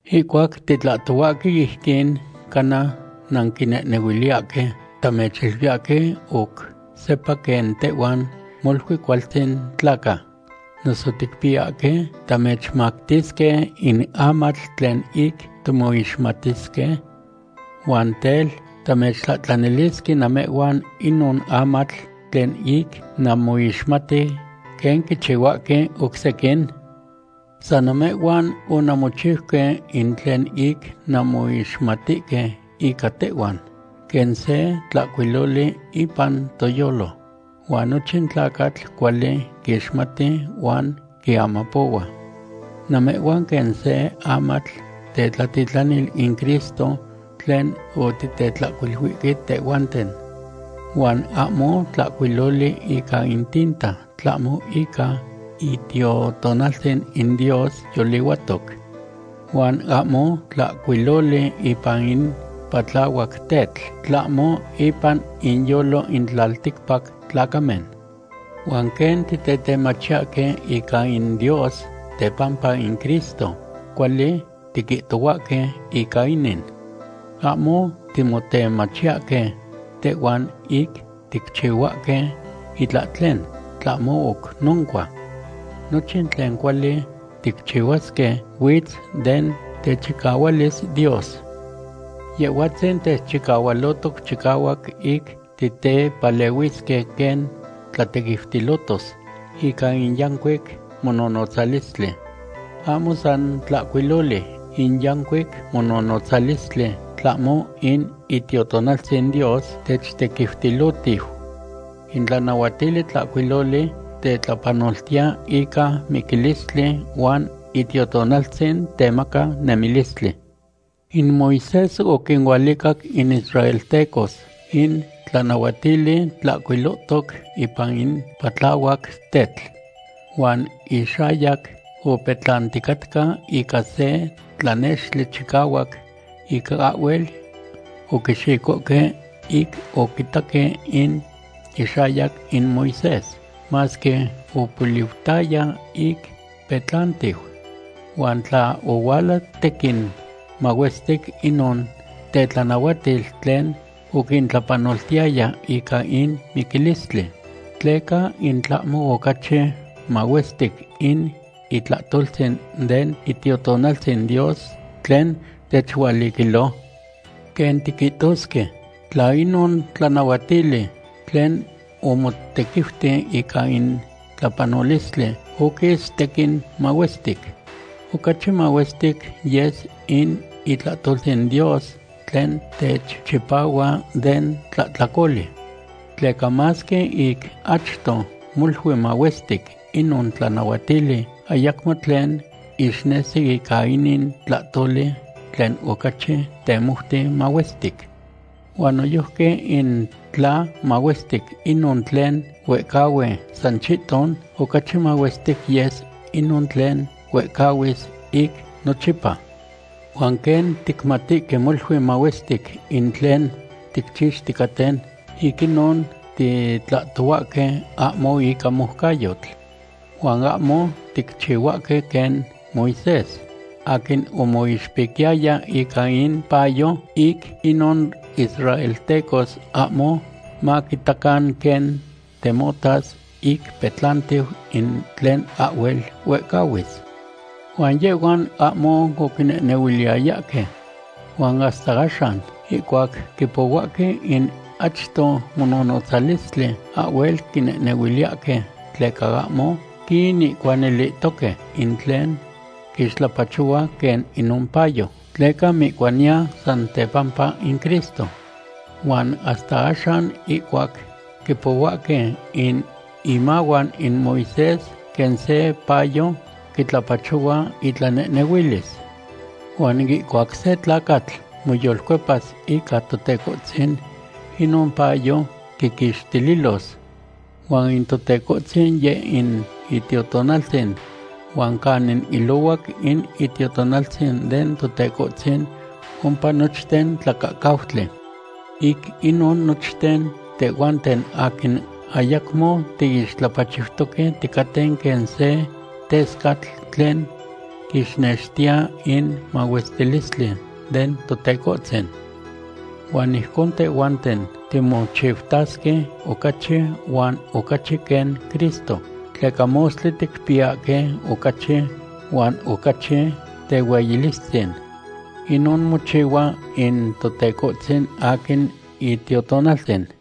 Ihcuac titlahtohuahque ijquin, cana nanquinehnehuiliyahque tamechiluiyahque oc sepa quen tehhuan molui cualtzin tlaca. ¿Noso ticpiyahque tamechmactisque in amatl tlen ic timoixmatisque? Huan tel, ¿tamechtlahtlanilisque namehhuan inon amatl tlen ic namoixmati, quen quichihuahque oc sequin? San namehhuan onanmochiuque in tlen ic nanmoixmatihque ica tehhuan, quen se tlahcuiloli ipan toyolo, huan nochin tlacatl cuali quixmati huan quiamapohua. Namehhuan quen se amatl tetlatitlanil in Cristo tlen otitetlahcuiluihque tehhuanten. Huan ahmo tlahcuiloli ica in tinta, tlahmo ica Itiotonaltzin in Dios yolihuatoc. Huan ahmo tlahcuiloli ipan in patlahuac tetl, tlahmo ipan inyolo in tlalticpac tlacamen. Huan quen titetemachiyahque ica in Dios tepampa in Cristo, cuali tiquihtohuahque ica inin. Ahmo timotemachiyahque tehhuan ic ticchihuahque itlahtlen. Tlahmo oc noncua, nochin tlen cuali ticchihuasque huitz den techicahualis Dios. Yehhuatzin techchihualotoc chicahuac ic titepalehuisque quen tlatequiutilotos ica in yancuic mononotzalistli. Ahmo san tlahcuiloli in yancuic mononotzalistli, tlahmo in Itiotonaltzin Dios techtequiutilohtiu. In tlanahuatili tlahcuiloli tetlapanoltiya ica miquilistli huan Itiotonaltzin temaca nemilistli. In Moisés oquinualicac in israeltecos in tlanahuatili tlahcuilohtoc ipan in patlahuac tetl. Huan ixayac opetlanticatca ica se tlanextli chicahuac ic ahhuel oquixicohque ic oquitaque in ixayac in Moisés, masque opoliutaya ic petlantiu. Huan tla ohuala tequin mahuestic inon tetlanahuatil tlen oquintlapanoltiyaya ica in miquilistli, ¿tleca in tlahmo ocachi mahuestic in itlahtoltzin den Itiotonaltzin Dios tlen techualiquilo? Quen tiquihtosque, tla inon tlanahuatili tlen omotequiuti ica in tlapanolistli oquis tequin mahuestic, ocachi mahuestic yes in itlahtoltzin Dios tlen techchipahua den tlahtlacoli. Tleca masque ic achto molui mahuestic inon tlanahuatili, ayacmo tlen ixnesi ica inin tlahtoli tlen ocachi temoute mahuestic. Huan noyojqui in tla mahuestic inon tlen huehcahui san chihton, ocachi mahuestic yes inon tlen huehcahuis ic nochipa. Huan quen ticmatihque molui mahuestic in tlen ticchixticaten, ic inon titlahtohuahque ahmo ica moucayotl. Huan ahmo ticchihuahque quen Moisés, aquin omoixpiquiyaya ica in payo, ic inon israeltecos ahmo maquitacan quen temotas ic petlantiu in tlen ahhuel huehcahuis. Huan yehhuan ahmo oquinehnehuiliyayahque. Huan hasta axan, ihcuac quipohuahque in achto mononotzalistli, ahhuel quinehnehuiliyahque, tleca ahmo quinihcuanilihtoque in tlen quixtlapachohua quen inon payo, tleca mihcuaniya san tepampa in Cristo. Huan hasta axan ihcuac quipohuahque in imahuan in Moisés, quen se payo quitlapachohua intlanehnehuilis. Huan ihcuac se tlacatl moyolcuepas ica Totecohtzin, inon payo quiquixtililos. Huan in Totecohtzin yeh in Itiotonaltzin, huan canin ilohuac in Itiotonaltzin den Totecohtzin, ompa nochten tlacahcautli. Ic inon nochten tehhuanten aquin ayacmo tiixtlapachiutoque, ticaten quen se tescatl tlen quixnextiya in mahuestilistli den Totecohtzin. Huan ijcon tehhuanten timochiutasque ocachi huan ocachi quen Cristo, tleca mostli ticpiyahque ocachi huan ocachi tehueyilistzin. Inon mochihua in Totecohtzin, aquin Itiotonaltzin.